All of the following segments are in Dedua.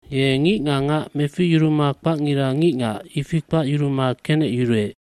bYe ngic nga ngac meficyuruma kpacngira ngicngac, ifi kpacyuruma kenecyuruec.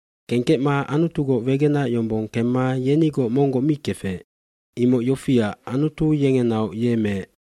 dKengkecma Anutugoc wegenac yombong kemma yenigoc monggoc mi kefec. Imoc yofiac Anutu yengenaoc ye meec.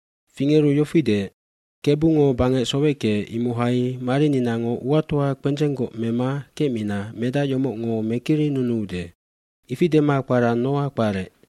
fFingeru yofi deec, “Kebungo bangec soweckeec imohai marininango uatoa kpendzenggoc mema kecmina medac yomocngo mekirinunuude. Ifi dema kpara Noae kparec.”